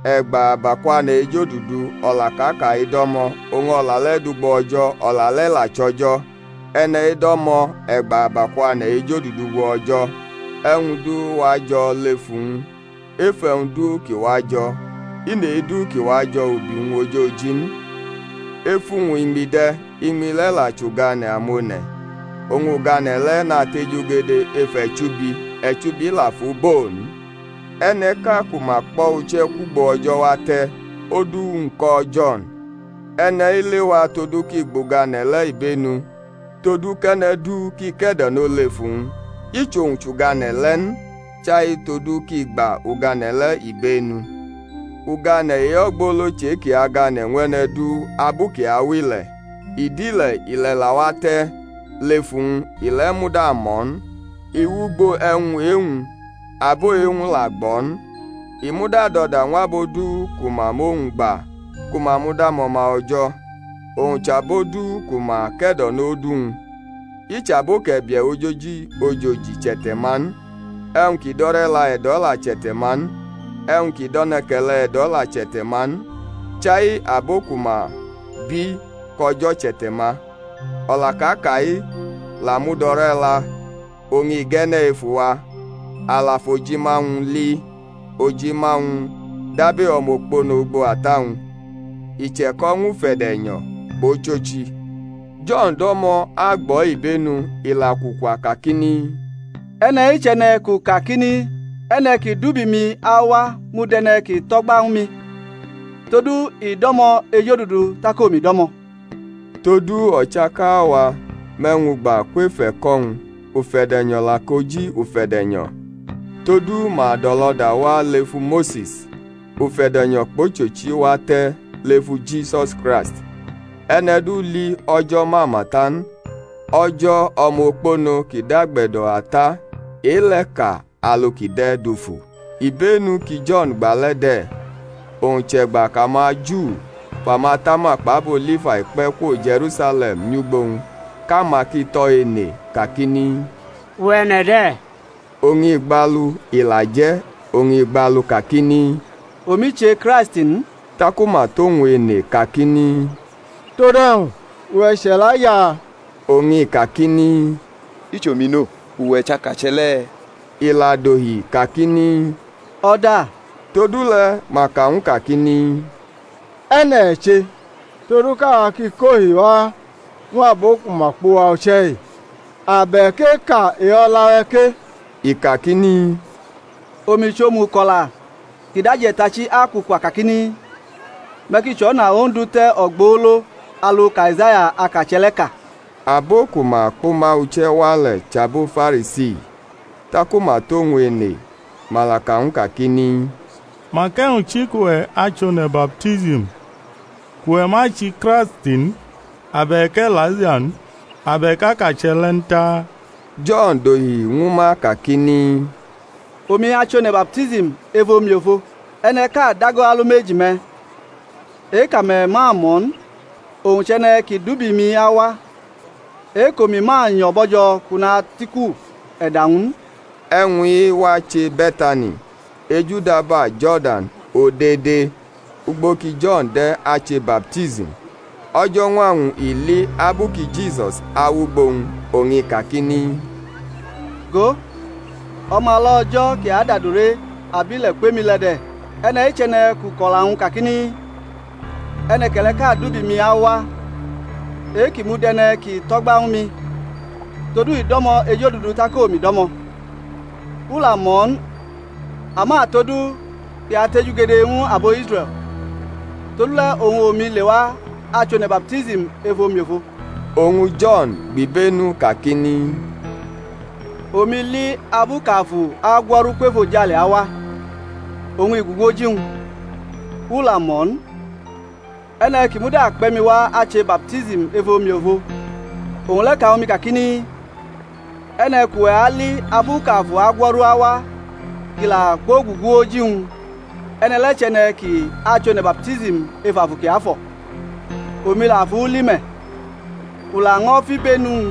E̩gba abakwane̩ ejodudu o̩la kʼa ka-i do̩mo̩. Oñ o̩la le̩ dʼugbo O̩jo̩. O̩la le̩ la chʼO̩jo̩. E̩ne̩-i do̩mo̩ e̩gba abakwane̩ ejodudu ugbo O̩jo̩. E̩wñ du wajo̩ lef uwñ, ef e̩wñ du ki wajo̩, i nʼe-du ki wajo̩ ubi-wñ ojoji n. Ef uwñ iñmi de̩; iñmi le̩ la chʼugane̩ amone̩. Oñ ugane̩ le̩ natejugede ef e̩chubi, e̩chubi la fʼu bo n. E̩ne̩ʼka ku ma kpʼo̩ uche̩ kwugbo O̩jo̩ wate̩, odu-wñ ko̩ Jo̩n. E̩ne̩-i lewa todu kʼi gbʼugane̩ le̩ ibenu, todu kʼe̩ne̩ du ki ke̩do̩no lef uwñ. I chʼowñ chʼugane̩ le̩ n, chai todu kʼi gba ugane̩ le̩ ibenu. Ugane̩ e-ogbolo chʼe-ki agane̩ ñw e̩ne̩ du abu kʼi awʼile̩. I dʼile̩, ile̩ la wate̩ lef uwñ, ile̩ muda mʼo̩ n. I wʼugbo e̩wñ e-wñ; abo e-wñ la gbʼo̩ n. I muda dʼo̩da ñw abo du ku ma mʼowñ gba ku ma mud amo̩ma O̩jo̩: owñ chʼabo du ku ma ke̩do̩nʼodu-wñ. I chʼabo kʼe̩bie̩ ojoji ojoji chʼe̩te̩-ma n; e̩wñ ki dʼo̩re̩la e̩do̩ la chʼe̩te̩-ma n; e̩wñ ki dʼe̩ne̩ke̩le̩ e̩do̩ la chʼe̩te̩-ma n; chai abo ku ma bi kʼO̩jo̩ chʼe̩te̩-ma. O̩la kʼa ka-i la mud ore̩la oñ i ge̩ne̩ ef uwa, (a la fʼojima-wñ li, ojima-wñ dab e-omokpono ugbo Ata-wñ), i che̩ko̩ ñw ufe̩de̩nyo̩ kpʼochochi. Jo̩n do̩mo̩ agbʼo̩ ibenu, ila kwukwa kakini, E̩ne̩-i chʼe̩ne̩ kʼu kakini, E̩ne̩ kʼi dʼubi-mi awa mud e̩ne̩ ki tʼo̩gba ñwu mi, todu i do̩mo̩ ejodudu tak omi do̩mo̩. Todu o̩chaka wa mʼe̩wñ gba kwef e̩ko̩-wñ, ufe̩de̩nyo̩ la koji ufe̩de̩nyo̩. Todu ma dʼo̩lo̩da wa lefu Mose̩s; ufe̩de̩nyo̩ kpʼochochi wate̩ lefu Jisus Kraist. E̩ne̩ du li O̩jo̩ mama ta n; O̩jo̩, O̩mokpono kʼi dʼagbe̩do̩ Ata, e-le̩ ka alu kʼi de̩ dufu. Ibenu ki Jo̩n gba le̩ de̩, owñ chʼe̩gba kʼamaJu fʼamatama kpʼabo Lifai kpe̩ kwo Je̩rusale̩m nyʼugbo-wñ kʼama ki tʼo̩ ene kakini, Uwe̩, e̩ne̩ de̩? Oñ i gbalu, i la je̩; oñ i gbalu kakini, Omi che Kraisti n. Taku ma tʼowñ ene kakini, Tod e̩wñ? Uwe̩ chʼE̩laija? Oñ i kakini, I chʼomi no. Uwe̩ chʼakache̩ le̩? Ila dohi kakini, O̩da. Todule̩ ma ka ñw u kakini, E̩ne̩ e̩ che? todu kʼawa ki kʼohi wa ñw abo ku ma kpʼuwa uche̩-i. Ab e̩ kʼeka e-o̩la-we̩ ke? I kakini, Omi chʼomuko̩la ki dʼaje̩tachi akwukwa kakini, Me̩ ki chʼo̩na Ondu te̩ ogbolo alu kʼAizaya akache̩ le̩ ka. Abo ku ma kpʼuma uche̩ wa le̩ chʼabo Farisi. Taku ma tʼowñ ene, ma la ka ñw u kakini, Mak e̩wñ chi kʼuwe̩ achʼone̩ baptism? kʼuwe̩ ma chʼiKraisti n, abe̩k E̩laija n, abe̩k akache̩ le̩ n taa? Jo̩n dohi ñwu ma kakini, Omi achʼone̩ baptism ef omiofo; e̩ne̩ʼka dago alumeji-me̩ e-kʼame̩ ma mʼo̩ n; owñ chʼe̩ne̩ kʼi dʼubi mi awa, e-kʼomi ma nyo̩ bo̩jo̩ kʼu natʼiku e̩da-wñ n. E̩wñ-i wache Be̩tani, ejudaba Jo̩rdan odede ugbo ki Jo̩n de̩ ache baptism. O̩jo̩ñwa-wñ i li abu ki Jisus awʼugbo-wñ, oñ i kakini, Go, O̩mala O̩jo̩ ki adʼadure abile̩ kwʼemi le̩ de̩. E̩ne̩-i chʼe̩ne̩ kʼu kʼo̩la-wñ kakini, E̩ne̩ke̩le̩ʼka dʼubi mi awa e-kʼi mud e̩ne̩ ki tʼo̩gba ñwu mi, todu i do̩mo̩ ejodudu tak omi do̩mo̩. U la mʼo̩ n; ama todu kʼi atejugede ñw abo Israe̩l, todule̩ oñ omi lewa achʼone̩ baptism ef omiofo. Oñ Jo̩n gbʼibenu kakini, Omi li abu kʼAfu agwo̩ru kwʼefojale awa, oñ i gugu oji-wñ. U la mʼo̩ n; e̩ne̩ ki muda kpe̩ mi wa ache baptism ef omiofo, owñ le̩ ka ñwu mi kakini, E̩ne̩ kʼuwe̩ ali abu kʼAfu agwo̩ru awa kʼi la kwogugu oji-wñ, e̩ne̩ le̩ chʼe̩ne̩ ki achʼone̩ baptism ef Afu Kiafo̩. Omi la fʼu li me̩. U laño̩ fʼibenu-wñ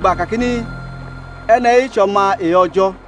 gba kakini, E̩ne̩-i chʼO̩ma e-O̩jo̩.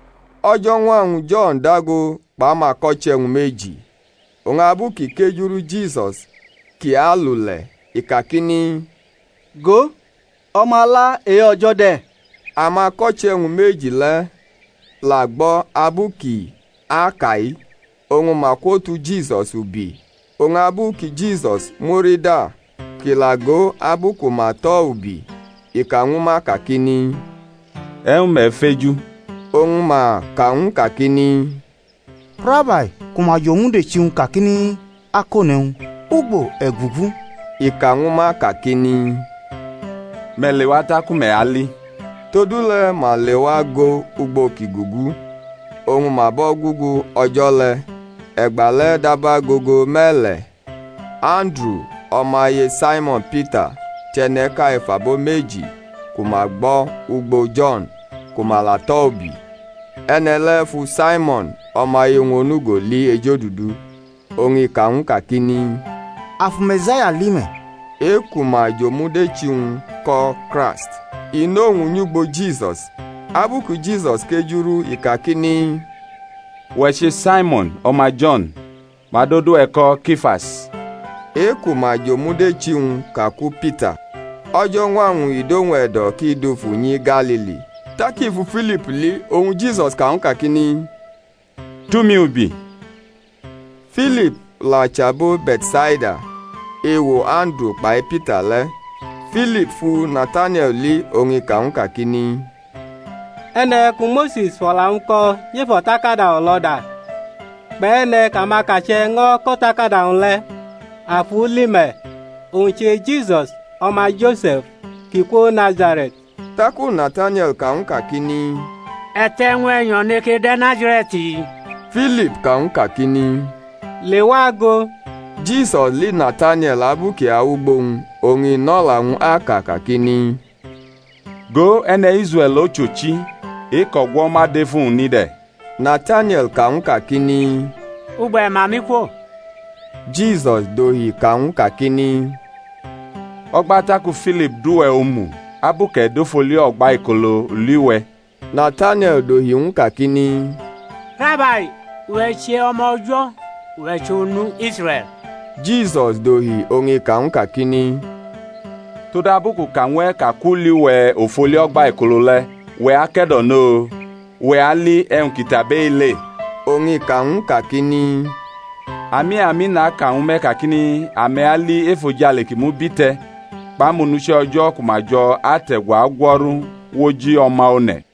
O̩jo̩ñwa-wñ Jo̩n dago kpʼamako̩che̩-wñ meji. Oñ abu kʼi kejuru Jisus kʼi alule̩, i kakini, Go, O̩mala e-O̩jo̩ de̩. Amako̩che̩-wñ meji le̩ la gbo̩ abu kʼi aka-i, oñ ma kwotu Jisus ubi. Oñ abu ki Jisus murida kʼi la go abu ku ma atʼo̩ ubi, i ka ñwu ma kakini, E̩wñ me̩ feju? Oñ ma ka ñw u kakini, Rabai (ku ma jʼomudechi-wñ kakini, Akone̩wñ), ugbo e̩ gugu? I ka ñwu ma kakini, Me̩ lewa taku me̩ ali. Todule̩ ma lewa go ugbo kʼi gugu, oñ ma bʼo̩ gugu o̩jo̩ le̩. E̩gbale̩ dab agogo me̩le̩. Anduru, o̩maye Saimo̩n Pita, chʼe̩ne̩ʼka ef abo meji ku ma gbo̩ ugbo Jo̩n ku ma la tʼo̩ ubi. E̩ne̩ le̩ fu Saimo̩n, o̩maye-wñ onugo li ejodudu, oñ i ka ñw u kakini, A fu Me̩saya li me̩, (e-ku ma jʼomudechi-wñ ko̩ Kraisti). I nʼowñ nyʼugbo Jisus. Abu ki Jisus kejurʼu i kakini, Uwe̩ che Saimo̩n, o̩ma Jo̩n; ma adʼodu-we̩ ko̩ Kifas, (e-ku ma jomudechi-wñ ka ku Pita Oji Pita chʼokuta.). O̩jo̩ñwa-wñ i dʼowñ e̩do̩ kʼi dufu nyi Galili. Tak i fu Filip li, oñ Jisus ka ñwu kakini, Tʼumi ubi. Filip la chʼabo Be̩tsaida, ewo Anduru kpai Pita le̩. Filip fu Natanie̩l li, oñ i ka ñw u kakini, E̩ne̩ ku Mose̩s fʼo̩la-wñ ko̩ nyʼef o̩takada o̩lo̩da, kpʼe̩ne̩ kʼamakache̩ ño̩ kʼo̩takada-wñ le̩, a fu li me̩. Owñ che Jisus, o̩ma Jo̩se̩f, kʼi kwo Nazare̩t. Taku Natanie̩l ka ñw u kakini, E̩te̩ e̩wñ e̩nyo̩ neke de̩ Nazare̩t? Filip ka ñw u kakini, Lewa go, Jisus li Natanie̩l abu kʼi awʼugbo-wñ, oñ i nʼo̩la-wñ aka kakini, Go, e̩ne̩ Israe̩l ochochi, e-kʼo̩gwo̩ ma dʼef uwñ ni de̩. Natanie̩l ka ñw u kakini, Ugbo e̩ ma mi kwo? Jisus dohi ka ñw u kakini, O̩gba taku Filip dʼuwe̩ omu, abu kʼe̩ dʼof oli o̩gbaikolo u li we̩. Natanie̩l dohi ñw u kakini, Rabai, Uwe̩ che O̩ma O̩jo̩; uwe̩ chʼOnu Israe̩l. Jisus dohi oñ i ka ñw u kakini, Todabu kʼu ka ñw e̩ ka kʼu li we̩ of oli o̩gbaikolo le̩, uwe̩ ake̩do̩no? Uwe̩ ali e̩wñ ki tʼabʼe-i le. Oñ i ka ñw u kakini, Ami, ami, naka ñwu me̩ kakini, Ame̩ ali efojale kʼi mubite̩, kpʼamonuche̩ O̩jo̩ ku ma jo̩ ate̩gu agwo̩ru wʼoji O̩ma One̩.